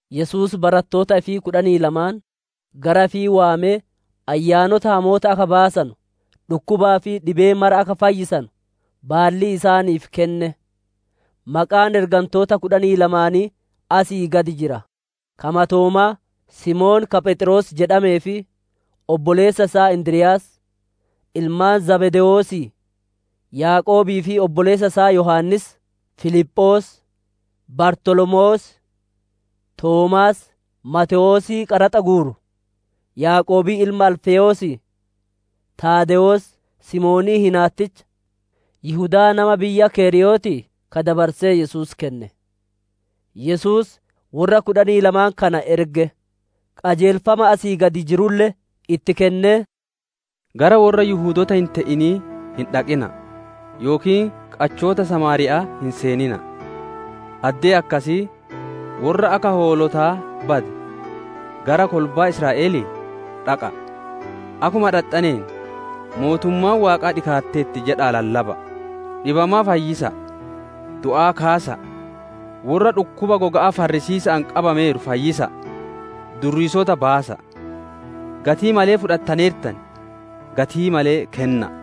Yesuus barattoota ifii kudhanii lamaan gara ifii waamee ayyaanota hamoota akka baasanu, dhukkubaa fi dhibee mara akka fayyisanu baallii isaaniif kenne. Maqaan ergantoota kudhanii lamaanii asii gad jira: ka matoomaa, Simoon ka «Pheexroos» jedhamee fi obboleessa isaa Indiryaas; ilmaan Zabdewoosii, Yaaqoobii fi obboleessa isaa Yohaannis; Filiphoos, Bartolomewoos, Toomaas, Maatewoosii qaraxa guuru, Yaaqoobii ilma Alfewoosii, Taadewoos; Simoonii hinaatticha, Yihudaa nama biyya keriyootii, ka dabarsee Yesuus kenne. Yesuus worra kudhanii lamaan kana erge; qajeelfama asii gad jirulle itti kennee, «Gara worra Yihudoota hin te'inii hin dhaqina'a, yookiin qachoota Samaariyya'aa hin seenina'a. Addee akkasii, Worra akka hoolotaa bade gara kolbaa Israa'elii dhaqa'a. Akkuma dhaxxaneen, ‹Mootummaan Waaqaa dhikaatteerti› jedhaa lallaba'a. Dhibamaa fayyisa'a, du'aa kaasa'a, worra dhukkuba goga'aa farrisiisa'aan qabameeru fayyisa'a, durriisota baasa'a. Gatii malee fudhattaneertan, gatii malee kenna'a.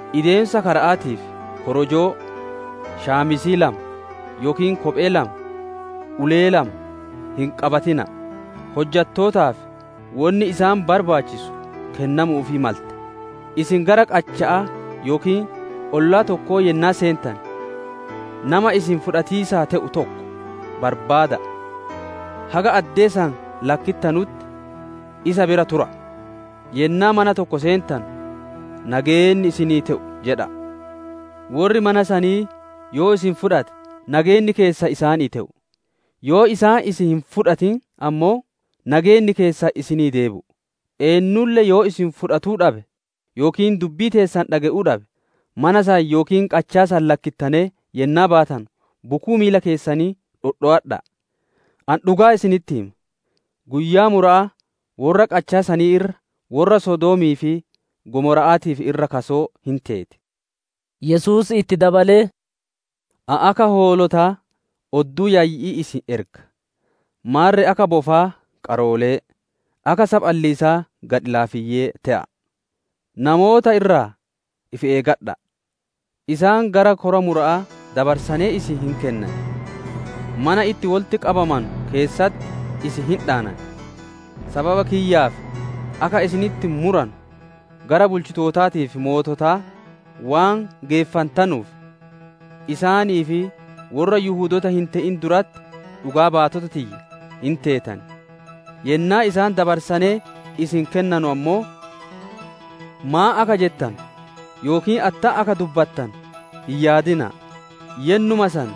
Ideemiisa kara'aatiif korojoo, qoloo lama, yookiin kophee lama, ulee lama hin qabatina'a. Hojjattootaaf wonni isaan barbaachisu kennamuufii malte. Isin gara qachaa yookiin ollaa tokkoo yennaa seentane, nama isin fudhatiisaa te'u tokko barbaada'a, haga addee san lakkittanutti isa bira tura'a. Yennaa mana tokko seentanu, ‹Nageenni isinii te'u› jedha'a. Worri mana sanii yoo isin fudhate, nageenni keessan isaanii te'u; yoo isaan isin hin fudhatin ammoo, nageenni keessan isinii deebi'u. Eennulle yoo isin fudhatuu dhabe yookiin dubbii teessan dhage'uu dhabe, mana san yookiin qachaa san lakkittanee yennaa baatanu bukuu miila keessanii dhodhowadha'a. Ani dhugaa isinitti hima, guyyaa mura'aa worra qachaa sanii irra worra Sodoomii fi Gomora'aatiif irra kasoo hin teeti» jedhe. Yesuus itti dabalee, «Ani akka hoolotaa odduu yayyi'ii isin erga; maarre akka bofaa qaroolee, akka saphaliisaa gadhi-laafeyyii te'a'a. Namoota irraa ifi eeggadha'a; isaan gara kora mura'aa dabarsanee isin hin kennan, mana itti wolitti qabamanu keessatti isin hin dhaanan. Sababa kiyyaaf akka isinitti muranu gara bulchitootaa fi moototaa waan geeffantanuuf, isaanii fi worra Yihudoota hin te'in duratti dhugaa baatota tiyya hin teetan. Yennaa isaan dabarsanee isin kennanu ammoo, maan akka jettanu yookiin attam akka dubbattanu hin yaadina'a; yennuma san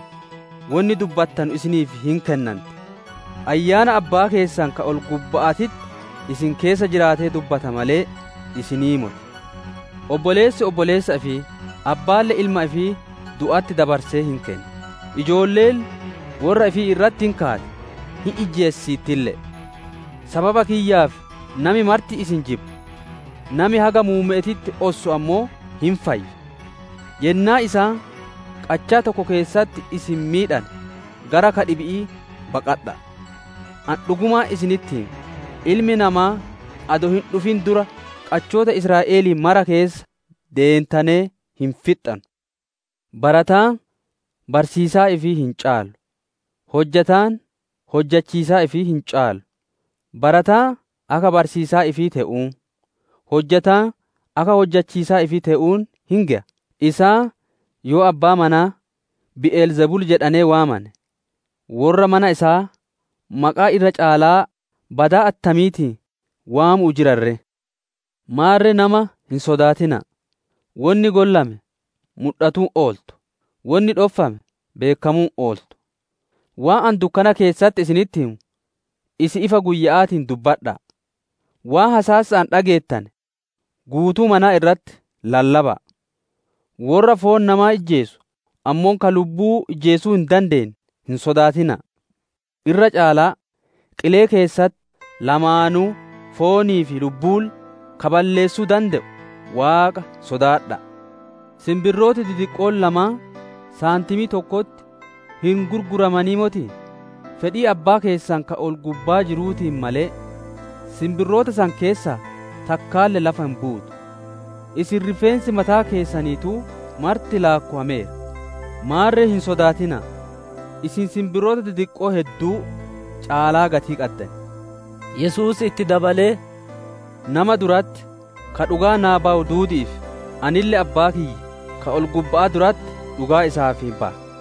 wonni dubbattanu isiniif hin kennanti. Ayyaana Abbaa keessan ka ol-gubba'aatitti isin keessa jiraatee dubbata malee, isinii moti. «Obboleessi obboleessa ifii, abbaalle ilma ifii du'atti dabarsee hin kenna; ijoolleelle worra ifii irratti hin kaati; hin ijjeesisiittille'e. Sababa kiyyaaf nami marti isin jibba. Nami haga muumme'eetitti ossu ammoo hin fayya. Yennaa isaan qachaa tokko keessatti isin miidhane, gara ka dhibi'ii baqadha'a. Ani dhugumaan isinitti hima, Ilmi Namaa adoo hin dhufiniin dura qachoota Israa'elii mara keessa deentanee hin fixxanu. «Barataan barsiisaa ifii hin caalu, hojjataan hojjachiisaa ifii hin caalu. Barataan akka barsiisaa ifii te'uun, hojjataan akka hojjachiisaa ifii te'uun hin geya. Isaan yoo abbaa manaa, ‹Bi'el Zebul› jedhanee waamane worra mana isaa maqaa irra caalaa badaa attamiitiin waamu'uu jiran ree! Maarre nama hin sodaatina'a. Wonni gollame mudhatuu hin ooltu; wonni dhoffame beekkamuu hin ooltu. Waan ani dukkana keessatti isinitti himu, isin ifa guyya'aatiin dubbadha'a. Waan hasaasa'aan dhageettane guutuu manaa irraa lallaba'a. Worra foon namaa ijjeesu, ammoo ka lubbuu ijjeesuu hin dandeenne hin sodaatina'a; irraa caalaa, qilee keessatti lamaanuu foonii fi lubbuulle ka balleessuu dande'u Waaqa sodaadha'a. Sinbirrooti didiqqoon lamaan saantimii tokkotti hin gurguramanii motii? Fedhii Abbaa keessan ka ol-gubbaa jiruutiin malee sinbirroota san keessaa takkaalle lafa hin buutu. Isin rifeensi mataa keessaniituu marti laakkowameera. Maarre hin sodaatina'a; isin sinbirroota didiqqoo hedduu caalaa gatii qaddan» jedhe. Yesuus itti dabalee, «Nama duratti ka dhugaa naa bayu duudi'iif, anille Abbaa kiyya ka ol-gubba'aa duratti dhugaa isaaf baya.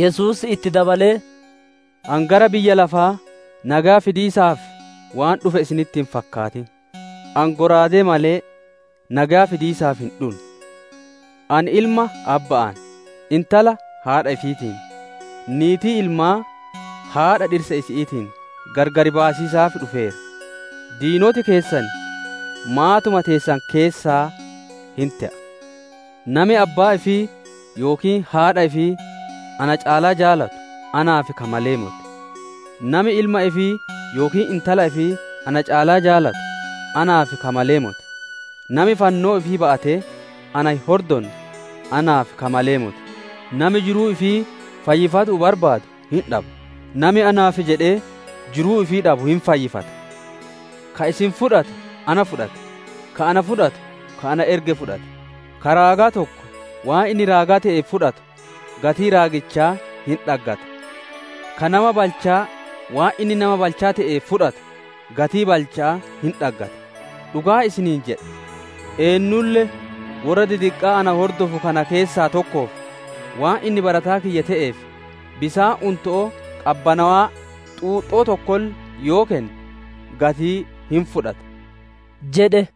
Yesuus itti dabalee, «Ani gara biyya lafaa nageya fidiisaaf waan dhufe isinitti hin fakkaatin. Ani shallaagaa malee, nageya fidiisaaf hin dhunne. Ani ilma abba'aan, intala haadha ifiitiin, niitii ilmaa haadha dhirsa isi'iitiin gargar baasiisaaf dhufeera. Diinoti keessan maatuma teessan keessaa hin te'a. «Nami abbaa ifii yookiin haadha ifii na caalaa jaalatu naaf ka malee moti; nami ilma ifii yookiin intala ifii na caalaa jaalatu naaf ka malee moti. Nami fannoo ifii ba'atee na hin hordonne naaf ka malee moti. Nami jiruu ifii fayyifatuu barbaadu hin dhaba, nami naaf jedhee jiruu ifii dhabu hin fayyifata. «Ka isin fudhatu na fudhata; ka ana fudhatu ka ana erge fudhata. Ka raagaa tokko waan inni raagaa te'eef fudhatu, gatii raagichaa hin dhaggata. Ka nama balchaa waan inni nama balchaa te'eef fudhatu, gatii balcha'aa hin dhaggata. Dhugaa isiniin jedha, eennulle worra didiqqaa na hordofu kana keessaa tokkoof, waan inni barataa kiyya te'eef, bisaan unto'oo qabbanawaa xuuxxoo tokkolle yoo kenne, gatii hin fudhata» jedhe.